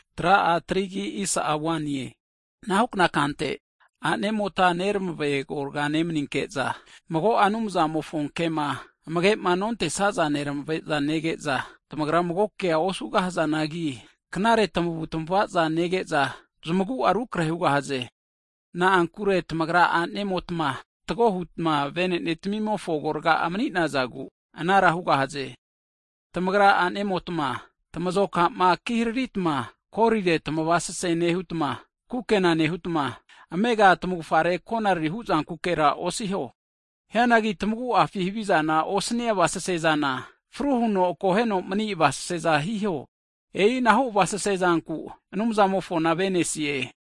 Hagi anahukna kante, a'nemotma neramave agorga nemaninke'za, mago'a Anumzamofo kema amagema nontesaza neramave'za nege'za, mago kea osugahazanagi, knare tamavutamavaza nege'za zamagu'a rukrahe hugahaze. Na'ankure tamagra a'nemotma fatgo hutma vetamimofo agorga'a mani'nazagu anara hugahaze. Tamagrama a'nemotma tamazoka'ma ki hariritma golire tamavasese nehutma, kukena nehutma, amega tamavufgare konariri huzankukera osiho. Hianagi tamagu'afi havizama osania avasesezana, fru huno akoheno mani avasese'za hiho. E'inahu avasese zanku Anumzamofona avenesie.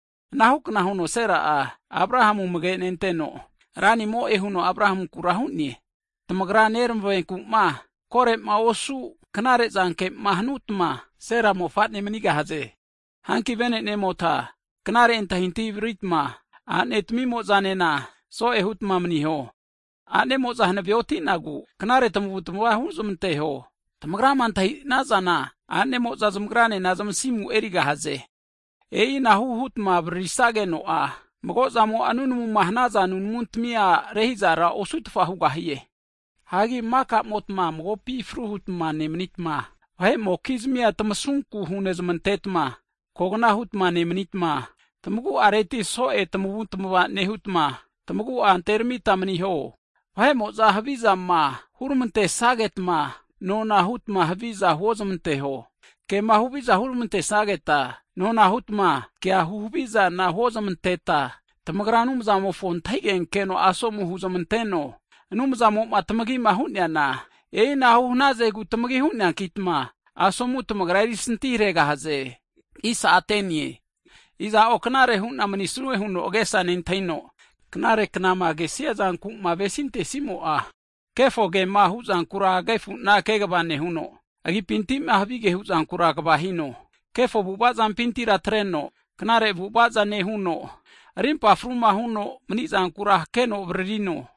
Anahukna huno Sera'a Abrahamu amage nenteno, ranimo'e huno Abrahamunkura hu'ne. Tamagra neramave agoraga nemanita knare zanke'ma hanutma, Sera mofane manigahaze. Hanki vene'nemota knare antahintahi avariritma, a'ne tamimo'zanena so'e hutma maniho. A'nemo'za hanave oti'nagu, knare tamavutmava huzmanteho. Tamagrama antahi'nazana a'nemo'za zamagranena zmasimu erigahaze. E'inahu hutma avaririsageno'a, magozamo'a nunamuma hanaza nunamuntamia rehizara osutfa hugahie. Hagi maka'motma magopi fru hutma nemanitma, vahe'mokizmia tamasunku hunezmantetma, kogna hutma nemanitma, tamagu'areti so'e tamavutma nehuta, tamagu'a anteramita maniho. Vahe'mo'za havizama huramantesagetma, nona hutma haviza huozamanteho. Kema huhavizama huramantesageta, nona hutma kea huhavizana huozmanteta, tamagra Anumzamofo antahigenkeno asomu huzmanteno, Anumzamo'ma tamagima hu'neana, e'inahu hanazegu tamagi hu'neankitma, asomura tamagra erisanti haregahaze. Iza'o knare hu'na manisue huno agesa nentahino, knare knama kesiazanku'ma avesintesimo'a, kefo kema hu'zankura agefu'na kegava nehuno, agipinti'ma havige huzankura kva hino. Kefo avu'avazampintira atreno, knare avu'avaza nehuno, rimpa fruma huno mani'zanku hakeno avaririno.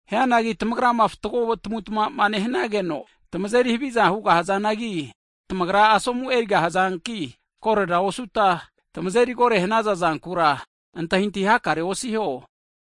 Hianagi tamagrama fatgo tamavutamava'ma nehanage'za, tamazeri haviza hugahazanagi tamagra asomu erigahazanki, korera osuta tamazeri kore hanaza zankura antahintahi hakare osiho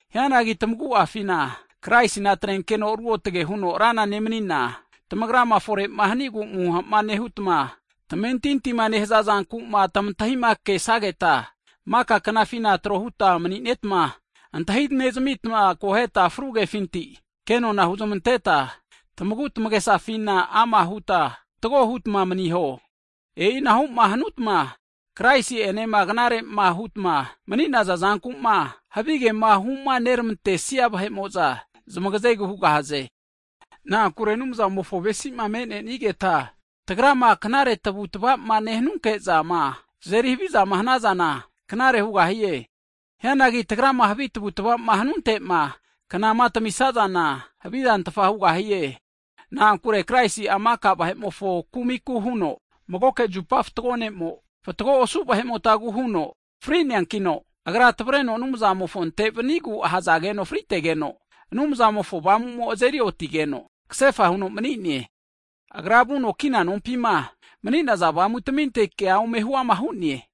Hianagi tamagu'afina Kraisina atrenkeno ruotge huno Rana nemanina, tamagrama fore'ma hanigu amuha'ma nehutma tamentintima nehaza zanku'ma tamantahima kesageta, maka knafina tro hutma mani'netma, antahinezamita akohetma fru kefinti kenona hunezmanteta, tamagutamagesafina ama' huta fatgo hutma maniho. E'inahu'ma hanutma, Kraisi'enema knare'ma hutma mani'naza zanku'ma havigema humaneramantesia vahe'mo'za zamagazegu hugahaze. Na'ankure Anumzamofo avesi'ma me'nenigeta tagrama knare tavu'tava'ma nehanunke'zama, tazeri havizama hanazana, knare hugahie. Hianagi tagrama havi tavutavama hanunte'ma, knama tamisazana havizantfa hugahie. Na'ankure Kraisi'a maka vahe'mofo kumiku huno, magoke zupa fatgo ne'mo, fatgo osu vahe'motagu fri'neankino, Agra tavareno Anumzamofonte vanigu ahazageno fritegeno, Anumzamofo Avamu'mo azeri otigeno, kasefa huno mani'ne. Agra vuno kina kumapima mani'naza avamutaminte kea ome huama hu'ne.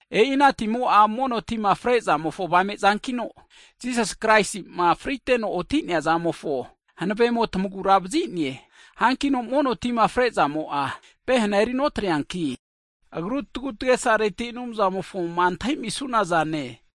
E'i ana timo'a mono tima frezamofo avame zankino, Jisasi Kraisi'ma friteno oti'neazamofo hanavemo tamagura vazi'ne. Hankino mono tima frezamo'a pehena erinotreanki, agru tagutagesareti Anumzamofoma antahimisunazane.